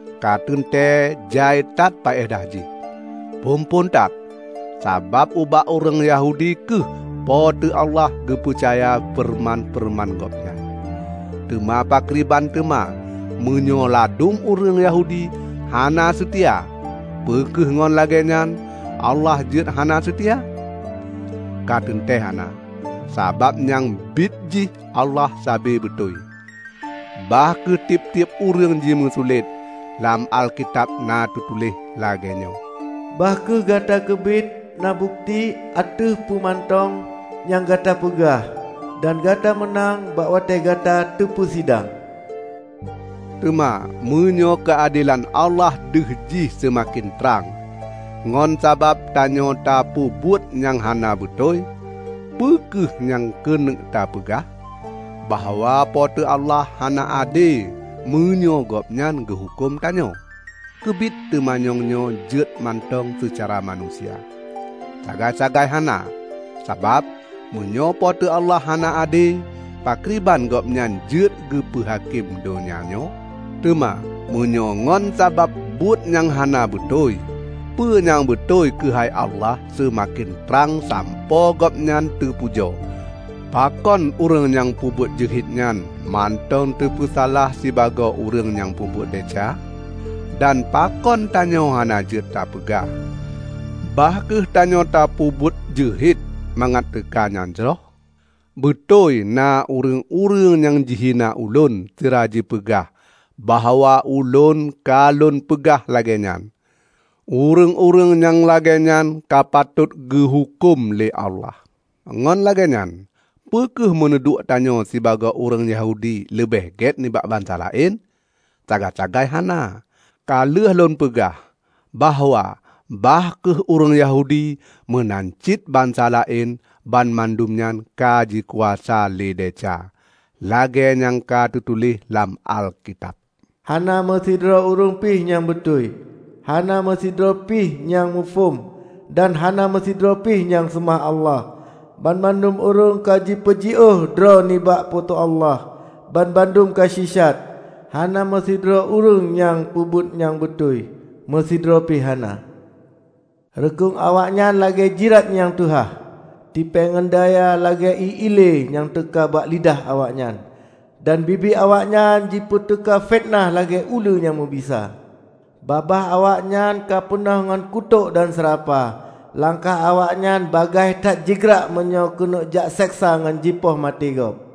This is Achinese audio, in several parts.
Ka teuntée jai that paedah jih! Phon-phon that, sabab ubak ureuëng Yahudi kheueh Po teu Allah geupeucaya feureuman-feureuman Gobnyan. Teuma pakriban teuma meunyoe ladum ureuëng Yahudi hana seutia? Peu kheueh ngon lagée nyan Allah jeuet hana seutia? Ka teuntée hana! Sabab nyang biet jih Allah sabe beutôi, bah kheueh tieb-tieb ureuëng jimeusulet. Lam Alkitab na teutuléh lagée nyoe, "Bah kheueh gata keubiet na bukeuti ateueh peue mantong nyang gata peugah, dan gata meunang bak watée gata teupeusidang." Teuma meunyoe keuadelan Allah deuh jih seumaken trang, ngon sabab tanyoe tapeubuet nyang hana beutôi, peu kheueh nyang keuneuk tapeugah? Bahwa Po teu Allah hana ade meunyoe Gobnyan geuhuköm tanyoe? (Keubiet teumanyong nyoe jeuet mantong seucara manusia.) Sagai-sagai hana! Sabab, meunyoe Po teu Allah hana ade, pakriban Gobnyan jeuet geupeu hakém donya nyoe? Teuma meunyoe ngon sabab buet nyang hana beutôi, peue nyang beutôi keuhai Allah seumaken trang sampoe Gobnyan teupujoe, pakon ureuëng nyang peubuet jeuhet nyan mantong teupeusalah sibagoe ureuëng nyang peubuet desya? Dan pakon tanyoe hana jeuet tapeugah, "Bah kheueh tanyoe tapeubuet jeuhet mangat teuka nyang jroh?" Beutôi na ureuëng-ureuëng nyang jihina ulôn sira jipeugah bahwa ulôn ka lôn peugah lagée nyan. Ureuëng-ureuëng nyang lagée nyan ka patot geuhuköm lé Allah. Ngon lagée nyan, peue kheueh meuneuduek tanyoe sibagoe ureuëng Yahudi leubeh gét nibak bansa laén? Sagai-sagai hana! Ka lheueh lôn peugah bahwa bah kheueh ureuëng Yahudi meunan cit bansa laén, banmandum nyan ka jikuasa lé desya. Lagée nyang ka teutuléh lam Alkitab, "Hana meusidroe ureuëng pi nyang beutôi, hana meusidroe pi nyang muphom dan hana meusidroe pih nyang seumah Allah. Banmandum ureuëng ka jipeujiôh droe nibak Po teu Allah; banmandum ka sisat. Hana meusidroe ureuëng nyang peubuet nyang beutôi; meusidroe pi hana! Rukueng awaknyan lagée jirat nyang teuhah. Tipée ngon daya lagée ié ile nyang teuka bak lidah awaknyan, dan bibi awaknyan jipeuteuka fiteunah lagée uleue nyang meubisa. Babah awaknyan ka peunoh ngon kutok dan seurapa. Langkah awaknyan bagaih that jigrak meunyoe keuneuk jakseksa ngon jipoh maté gob.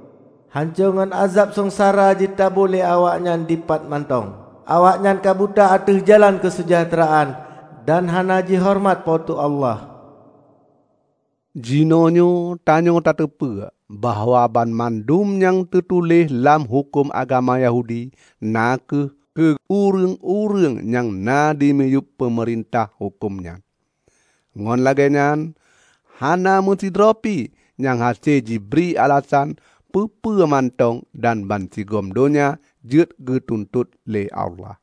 Hanco ngon ázeb seungsara jitabu lé awaknyan dipat mantong. Awaknyan ka buta ateueh jalan keuseujahteuraan, dan hana jihoreumat Po teu Allah." Jinoenyoe tanyoe tateupeue bahwa banmandum nyang teutuléh lam huköm agama Yahudi, na kheueh keu ureuëng-ureuëng nyang na dimiyueb peumeurintahan huköm nyan. Ngon lagée nyan hana meusidroe pi nyang hase jibri alasan peue-peue mantong dan bansigom donya jeuet geutuntot lé Allah.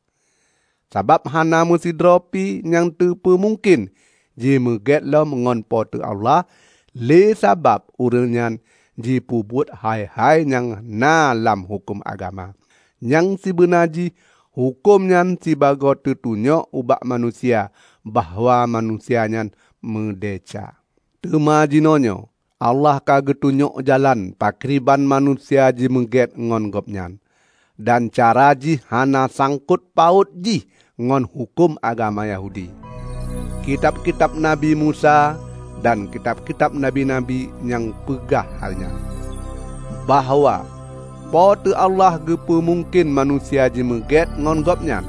Sabab hana meusidroe pi nyang teupeumungken jimeugét ngon Po teu Allah lé sabab ureuëng nyan jipeubuet hai-hai nyang na lam huköm agama. Nyang sibeuna jih huköm nyan sibagoe teutunyok ubak manusia bahwa manusia nyan meudesya. Teuma jinoenyoe Allah ka geutunyok jalan pakriban manusia jimeugét ngon Gobnyan; dan cara jihnyan hana sangkot paôt jih ngon huköm agama Yahudi. Kitab-kitab Nabi Musa dan kitab-kitab nabi-nabi nyang peugah hai nyan, bahwa Po teu Allah geupeumungken manusia jimeugét ngon Gobnyan,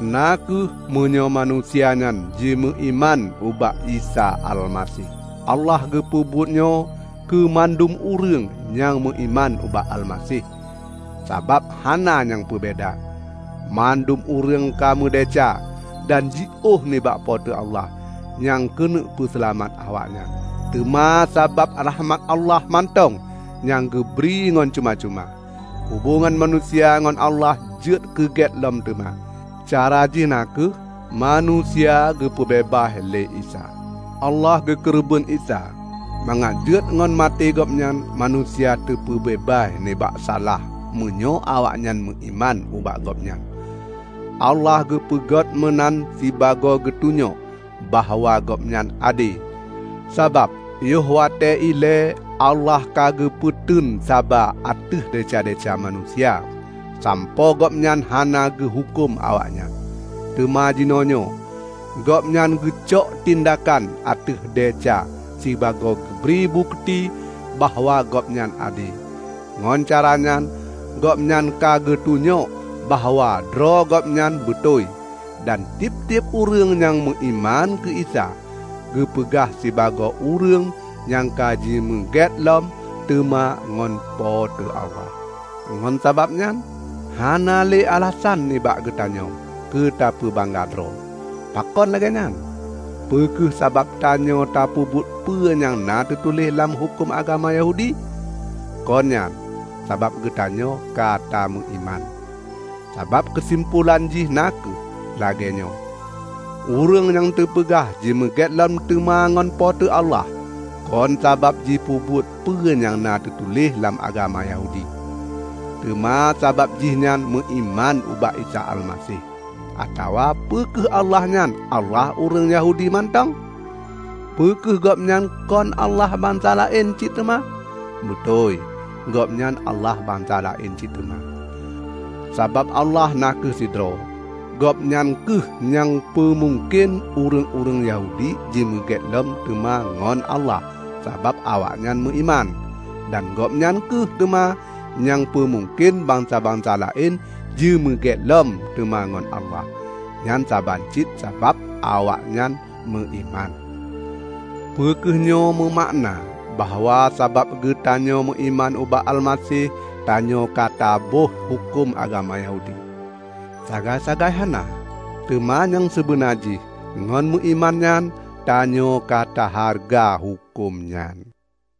na kheueh meunyoe manusia nyan jimeuiman ubak Isa Almaseh. Allah geupeubuetnyoe keu mandum ureuëng nyang meuiman ubak Almaseh; sabab hana nyang peubeda: Mandum ureuëng ka meudesya dan jiôh nibak Po teu Allah nyang keuneuk peuseulamat awaknyan. Teuma sabab rakhmat Allah mantong nyang geubri ngon cuma-cuma, hubongan manusia ngon Allah jeuet keugét lom teuma; cara jih na kheueh: manusia geupeubeubaih lé Isa. Allah geukeureubeuen Isa mangat jeuet ngon maté Gobnyan manusia kateupeubeubaih nibak salah meunyoe awaknyan meuiman ubak Gobnyan. Allah geupeuget meunan sibagoe geutunyok bahwa Gobnyan ade. Sabab yoh watée ilée Allah ka geupeuteun saba ateueh desya-desya manusia, sampoe Gobnyan hana geuhuköm awaknyan. Teuma jinoenyoe Gobnyan geucok tindakan ateueh desya sibagoe geubri bukeuti bahwa Gobnyan ade. Ngon caranyan Gobnyan ka geutunyok bahwa droe Gobnyan beutôi; dan tieb-tieb ureuëng nyang meuiman keu Isa, geupeugah sibagoe ureuëng nyang ka jimeugét lom teuma ngon Po teu Allah. Ngon sabab nyan hana le alasan nibak geutanyoe keutapeubangga droe. Pakon lagée nyan? Peu kheueh sabab tanyoe tapeubuet peue nyang na teutuléh lam huköm agama Yahudi? Kon nyan, sabab geutanyoe katameuiman. Sabab keusimpolan jih na kheueh lagée nyoe: Ureuëng nyang teupeugah jimeugét lom teuma ngon Po teu Allah, kon sabab jipeubuet peue nyang na teutuléh lam agama Yahudi, teuma sabab jihnyan meuiman ubak Isa Almaseh. Atawa peu kheueh Allah nyan Allah ureuëng Yahudi mantong? Peu kheueh Gobnyan kon Allah bansa laén cit teuma? Beutôi, Gobnyan Allah bansa laén cit teuma! Sabab Allah na kheueh sidroe. Gobnyan kheueh nyang peumungken ureuëng-ureuëng Yahudi jimeugét lom teuma ngon Allah sabab awaknyan meuiman. Dan Gobnyan kheueh teuma nyang peumungken bansa-bansa laén jimeugét lom teuma ngon Allah; nyan saban cit sabab awaknyan meuiman. Peu kheueh nyoe meumakna bahwa sabab geutanyoe meuiman ubak Almaseh, tanyoe ka taböih huköm agama Yahudi? Sagai-sagai hana! Teuma nyang seubeuna jih ngon meuiman nyan, tanyoe ka tahareuga huköm nyan.